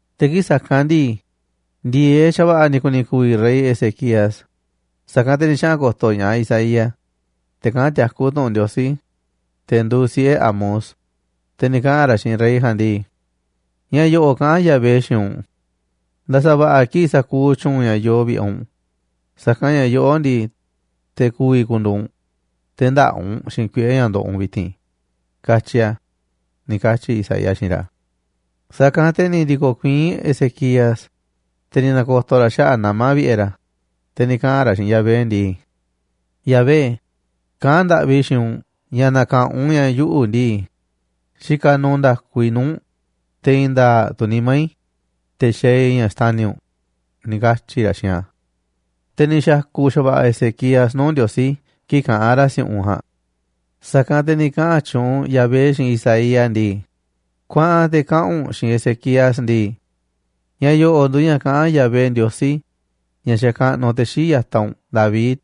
Te̱ kii̱ꞌ sa̱kanꞌ ndii, ndi̱e̱eꞌ xa̱va̱ꞌa̱ ni̱ ku̱ni̱ ku̱vi̱ rey Ezequías, sa̱kanꞌ te̱ ni̱ xaꞌa̱n ko̱to̱ ña̱ꞌaꞌ Isaías, te̱ kaꞌán tiakú tu̱ꞌu̱n Ndiosí, te̱ nduuꞌ siꞌe̱ Amoz, te̱ ni̱ kaꞌa̱n ra̱ xiinꞌ rey ja̱a̱nꞌ ndii: ―Ña̱ yo̱ꞌo̱ꞌ kaꞌán Yahvé xiinꞌ u̱nꞌ: “Nda̱sa̱ va̱ꞌa̱ kiꞌi̱ꞌ sa̱kuuꞌ tyu̱u̱n ña̱ yoꞌoꞌ vi̱ꞌe̱ u̱nꞌ, sa̱kanꞌ ña̱ yoꞌó ndii, te̱ ku̱vi̱ ku̱ndu̱u̱ u̱nꞌ, te̱ ndä̱ꞌa̱ u̱nꞌ xiinꞌ kuiꞌe̱ ña̱ ndoꞌoꞌ u̱nꞌ vi̱ti̱n”, katyi̱ a̱ ―ni̱ katyi̱ Isaías xiinꞌ ra̱. Sa̱kanꞌ te̱ ni̱ ndi̱ko̱ kuiín Ezequías, te̱ ni̱ na̱ko̱to̱ ra̱ xaꞌa̱ꞌ nama̱ vi̱ꞌe̱ ra̱, te̱ ni̱ kaꞌa̱n ra̱ xiinꞌ Yahvé ndii: ―Yahvé, kaꞌán ndaꞌvi i̱ xiinꞌ u̱nꞌ ña̱ na̱ka̱ꞌanꞌ u̱nꞌ ña̱ yuꞌu̱ ndii, xikaꞌ nuuꞌ nda̱ku i̱ nuu̱ꞌ u̱nꞌ, te̱ i̱i̱n nda̱a̱ꞌ tu̱ nimá i̱, te̱ xaaꞌ i̱ ña̱ xtani̱ u̱nꞌ ―ni̱ katyi̱ ra̱ xiinꞌ a̱. Te̱ ni̱ xa̱ku̱ xa̱va̱ꞌa̱ Ezequías nuu̱ꞌ Ndiosí kii̱ꞌ kaꞌán ra̱ si̱u̱ꞌunꞌ ja̱a̱nꞌ. Sa̱kanꞌ te̱ ni̱ kaꞌa̱n tyuunꞌ Yahvé xiinꞌ Isaías ndii: ―Kuaꞌa̱n te̱ kaꞌa̱n u̱nꞌ xiinꞌ Ezequías ndii: “Ña̱ yo̱ꞌo̱ꞌ nduuꞌ ña̱ kaꞌán Yahvé, Ndiosí, ña̱ xakaꞌnuꞌ te̱ xii̱ꞌ ya̱taꞌ u̱nꞌ David,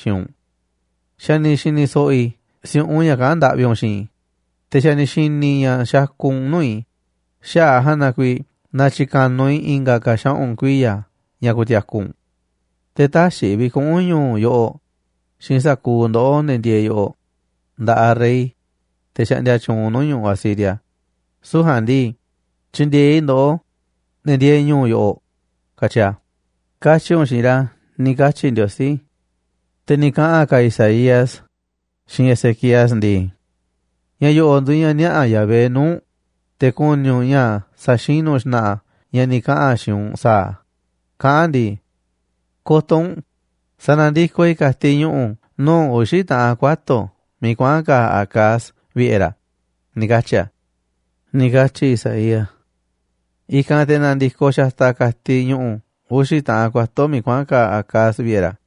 xiinꞌ u̱nꞌ: Xa̱ ni̱ xi̱ni̱ so̱ꞌo̱ i̱ si̱u̱ꞌunꞌ ña̱ kaꞌán ndaꞌvi u̱nꞌ xiinꞌ i̱, te̱ xa̱ ni̱ xi̱ni̱ i̱ ña̱ xakuꞌ u̱nꞌ nuu̱ꞌ i̱, xaꞌa̱ꞌ a̱ ja̱a̱nꞌ na kuiiꞌ na̱tyi̱ka̱nuꞌ i̱ i̱nga̱ ka̱ xaꞌu̱n kuiya̱ ña̱ ku̱ti̱a̱ku̱ u̱nꞌ. Te̱ tä̱xi̱ i̱ vi̱kuꞌu̱n ñu̱u̱ yoꞌoꞌ xiinꞌ sa̱kuuꞌ ndoꞌó, ne̱ ndieeꞌ yoꞌoꞌ, nda̱ꞌaꞌ rey, te̱ xaꞌndia tyuunꞌ nuu̱ꞌ ñu̱ꞌuꞌ Asiria, süu̱ꞌ ja̱a̱nꞌ ndii, tyi̱ndi̱e̱eꞌ i̱ ndoꞌó, ne̱ ndieeꞌ ñu̱u̱ yoꞌoꞌ, katyi a̱, katyi̱ u̱nꞌ xiinꞌ ra̱”, ―ni̱ katyi Ndiosí. Te̱ ni̱ kaꞌa̱n ka̱ Isaías xiinꞌ Ezequías ndii: ―Ña̱ yo̱ꞌo̱ꞌ nduuꞌ ña̱ niaꞌa̱ Yahvé nuu̱ꞌ u̱nꞌ, te̱ ku̱ni̱ u̱nꞌ ña̱ sa̱xinu̱ xna̱ꞌa̱ a̱ ña̱ ni̱ kaꞌa̱n a̱ xiinꞌ u̱nꞌ sa̱a̱ a̱, kaꞌán a̱ ndii: “Ko̱to̱ u̱nꞌ, sa̱na̱ndikoꞌ i̱ ka̱tiꞌ ñu̱ꞌu̱ nuu̱ꞌ uxi̱ taꞌan kuato̱ miiꞌ kuaꞌa̱n ka̱a̱ Acaz vi̱ꞌe̱ ra̱”, ni̱ katyi̱ a̱ ―ni̱ katyi̱ Isaías. I̱kanꞌ te̱ na̱ndi̱koꞌ xataꞌ ka̱tiꞌ ñu̱ꞌu̱ uxi̱ taꞌan kuato̱ miiꞌ kuaꞌa̱n ka̱a̱ Acaz vi̱ꞌe̱ ra̱.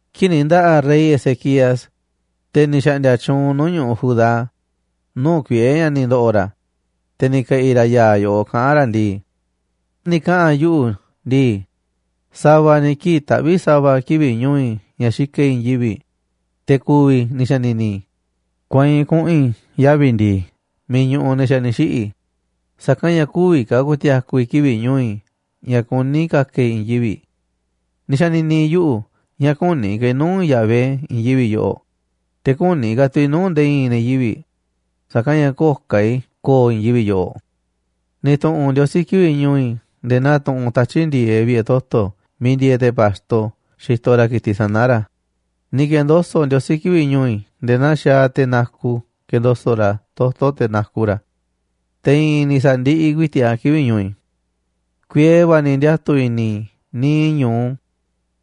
Kii̱ꞌ ni̱ nda̱ꞌa̱ rey Ezequías, te̱ ni̱ xa̱ꞌndi̱a̱ tyuunꞌ nuu̱ꞌ ñu̱ꞌuꞌ Judá, nuu̱ꞌ kuiꞌe̱ ña̱ ni̱ ndo̱ꞌo̱ ra̱, te̱ ni̱ ke̱ꞌi̱ ra̱ ya̱a̱ yoꞌoꞌ kaꞌán ra̱ ndii: “Ni̱ kaꞌa̱n yuꞌu̱ ndii: Sa̱va̱ ni̱ kii̱ꞌ taꞌvíꞌ sa̱va̱ kivi̱ꞌ ñu̱u̱ i̱ ña̱ xikaꞌ i̱ i̱i̱n yivi̱ꞌ, te̱ ku̱vi̱, ni̱ xa̱ni̱ni̱ i̱. Kueinꞌ kuꞌu̱n i̱ yavi̱ ndi̱i̱ miiꞌ ñuꞌuꞌ ne̱ xa̱ ni̱ xiꞌi̱, sa̱kanꞌ ña̱ kü̱vi̱ ka̱ ku̱ti̱a̱ku̱ i̱ kivi̱ꞌ ñu̱u̱ i̱ ña̱ kuní i̱ ka̱ka̱ i̱ i̱i̱n yivi̱ꞌ. Ni̱ xa̱ni̱ni̱ yuꞌu̱ ña̱ kü̱ni̱ ka̱ i̱ nuu̱ꞌ Yahvé i̱i̱n yivi̱ꞌ yoꞌoꞌ, te̱ kü̱ni̱ ka̱ tu̱ i̱ nuu̱ꞌ nde̱e̱ i̱i̱n ne̱ yivi̱ꞌ, sa̱kanꞌ ña̱ köo̱ꞌ ka̱ i̱ ko̱o̱ i̱i̱n yivi̱ꞌ yoꞌoꞌ. Ni̱ tu̱ꞌu̱n Ndiosí kivi̱ꞌ ñu̱u̱ i̱ nde̱e̱ naa tuꞌunꞌ tatyi̱ꞌ ndi̱e̱eꞌ vi̱ꞌe̱ toto̱ miiꞌ ndieeꞌ te̱ pa̱xto xitoꞌ ra̱ ki̱tiꞌ sana̱ ra̱. Ni̱ ke̱ndoso̱ꞌ Ndiosí kivi̱ꞌ ñu̱u̱ i̱ nde̱e̱ naa xaaꞌ te̱ naku kendoso̱ꞌ ra̱ toto̱ te̱ naku ra̱ a̱. Te̱ i̱i̱n ni̱ sa̱ndiꞌiꞌ ku̱i̱ti̱ꞌ a̱ kivi̱ꞌ ñu̱u̱ i̱. Kuiee va̱ ni̱ ndiatu̱ i̱ni̱ i̱ niiꞌ ñu̱u,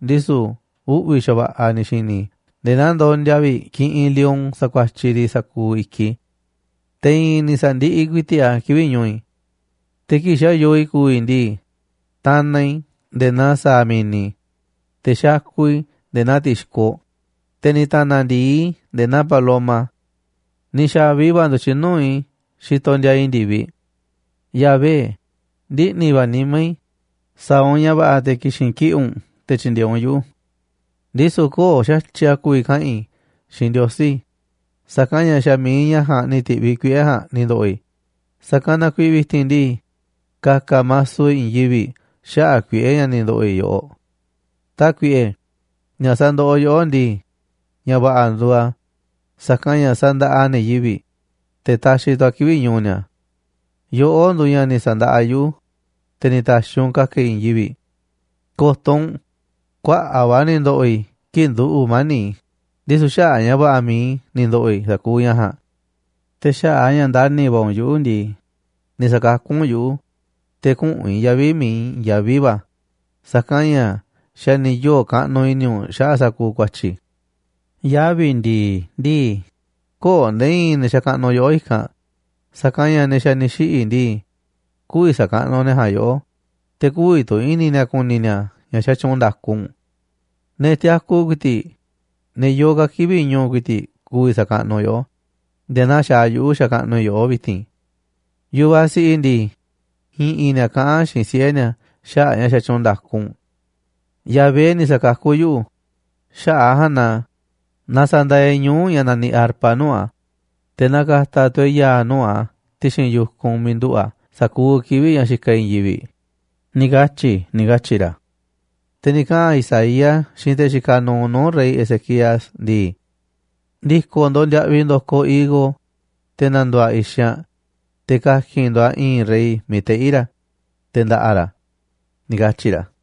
ndisu̱ uꞌvi̱ xa̱va̱ꞌa̱ ni̱ xi̱ni̱ i̱ nde̱e̱ naa ndondia vi̱ꞌ kiꞌinꞌ lion sakuatyiꞌ riꞌ sa̱kuuꞌ i̱kiꞌ i̱. Te̱ i̱i̱n ni̱ sa̱ndiꞌiꞌ ku̱i̱ti̱ꞌ a̱ kivi̱ꞌ ñu̱u̱ i̱. Te̱ kii̱ꞌ xa̱ yoo i̱ ku̱vi̱ ndii, tanaꞌ i̱ nde̱e̱ naa sa̱a̱ mi̱ni̱, te̱ xakuꞌ i̱ nde̱e̱ naa ti̱xkoꞌ, te̱ ni̱ ta̱na̱ ndi̱i i̱ nde̱e̱ naa paloma. Ni̱ xa̱vi va̱ ndu̱tyiꞌ nuu̱ꞌ i̱ xitoꞌ ndiaa i̱ ndi̱viꞌ. Yahvé, ndiꞌni̱ va̱ nimá i̱, sa̱a̱ u̱nꞌ ña̱ va̱ꞌa̱ te̱ ki̱xi̱n kiꞌi̱ꞌ u̱nꞌ te̱ tyi̱ndi̱e̱eꞌ u̱nꞌ yuꞌu̱. Ndisu̱ köo̱ꞌ xa̱tyiꞌ a̱ ku̱vi̱ kaꞌa̱n i̱ xiinꞌ Ndiosí, sa̱kanꞌ ña̱ xa̱ mi̱iꞌ ña̱ ja̱a̱nꞌ ni̱ ti̱ꞌviꞌ kuiꞌe̱ ja̱a̱nꞌ ni̱ ndo̱ꞌo̱ i̱, sa̱kanꞌ na kuiiꞌ vi̱ti̱n ndii, ka̱ka̱ maso i̱ i̱i̱n yivi̱ꞌ xaꞌa̱ꞌ kuiꞌe̱ ña̱ ni̱ ndo̱ꞌo̱ i̱ yoꞌoꞌ. Tákuiꞌe, ña̱ sandoꞌoꞌ yoꞌó ndii, ña̱ va̱ꞌa̱ nduuꞌ a̱, sa̱kanꞌ ña̱ sandaꞌa a̱ ne̱ yivi̱ꞌ, te̱ taxiꞌ tu̱ a̱ kivi̱ꞌ ñu̱u̱ ni̱a̱. Yoꞌó nduuꞌ ña̱ ni̱ sa̱ndaꞌa yuꞌu̱, te̱ ni̱ ta̱xi̱ u̱nꞌ ka̱ka̱ i̱ i̱i̱n yivi̱ꞌ. Ko̱to̱ u̱nꞌ, kuaꞌa̱ꞌ va̱ ni̱ ndo̱ꞌo̱ i̱ kii̱ꞌ nduꞌu̱ mani̱ꞌ i̱, ndisu̱ xaꞌa̱ꞌ ña̱ va̱ꞌa̱ mi̱iꞌ i̱ ni̱ ndo̱ꞌo̱ i̱ sa̱kuuꞌ ña̱ ja̱a̱nꞌ. Te̱ xaꞌa̱ꞌ a̱ ña̱ ndani̱ va̱ u̱nꞌ yuꞌu̱ ndii, ni̱ sa̱kakú u̱nꞌ yuꞌu̱, te̱ küꞌu̱n i̱ yavi̱ miiꞌ i̱i̱n yaví va̱, sa̱kanꞌ ña̱ xa̱ ni̱ yoo̱ kaꞌnuꞌ i̱ni̱ u̱nꞌ xaꞌa̱ꞌ sa̱kuuꞌ ku̱a̱tyi̱ i̱. Yavi̱ ndi̱i̱ ndii, köo̱ꞌ nde̱e̱ i̱i̱n ne̱ xakaꞌnuꞌ yoꞌó i̱kanꞌ, sa̱kanꞌ ña̱ ne̱ xa̱ ni̱ xiꞌi̱ ndii, kü̱vi̱ sa̱kaꞌnuꞌ ne̱ ja̱a̱nꞌ yoꞌó, te̱ kü̱vi̱ tu̱ i̱ni̱ ni̱a̱ ku̱ni̱ ni̱a̱ ña̱ xatyuunꞌ nda̱ku u̱nꞌ. Ne̱ tiaku ku̱i̱ti̱ꞌ, ne̱ yoo ka̱ kivi̱ꞌ ñu̱u̱ ku̱i̱ti̱ꞌ, ku̱vi̱ sa̱kaꞌnuꞌ yoꞌó nde̱e̱ naa xaaꞌ yuꞌu̱ xakaꞌnuꞌ i̱ yoꞌó vi̱ti̱n. Yu̱vaꞌ siꞌiꞌ ndii, i̱ꞌi̱n ni̱a̱ kaꞌán xiinꞌ siꞌe̱ ni̱a̱ xaꞌa̱ꞌ ña̱ xatyuunꞌ nda̱ku u̱nꞌ. Yahvé ni̱ sa̱kakú yuꞌu̱, xaꞌa̱ꞌ ja̱a̱nꞌ na na sa̱ndaaꞌ e̱ꞌ ñuu̱ꞌ ña̱ naniꞌ arpa nuu̱ꞌ a̱, te̱ na ka̱ta̱ tu̱ e̱ꞌ ya̱a̱ nuu̱ꞌ a̱ ti̱xi̱n yu̱kunꞌ miiꞌ nduꞌu̱ꞌ a̱ sa̱kuuꞌ kivi̱ꞌ ña̱ xikaꞌ e̱ꞌ i̱i̱n yivi̱ꞌ, ni̱ katyi̱ i̱”, ni̱ katyi̱ ra̱. Te̱ ni̱ kaꞌa̱n Isaías xiinꞌ te̱ xikaꞌ nuuꞌ nuu̱ꞌ rey Ezequías ndii: ―Ndi̱ko̱ ndo̱ꞌ ndiaꞌviꞌ ndo̱koꞌ higo, te̱ na̱ndu̱u̱ a̱ i̱xanꞌ, te̱ ka̱ki̱n ndo̱ꞌ a̱ i̱i̱nꞌ rey miiꞌ teꞌí ra̱, te̱ nda̱ꞌa̱ ra̱ ―ni̱ katyi̱ ra̱.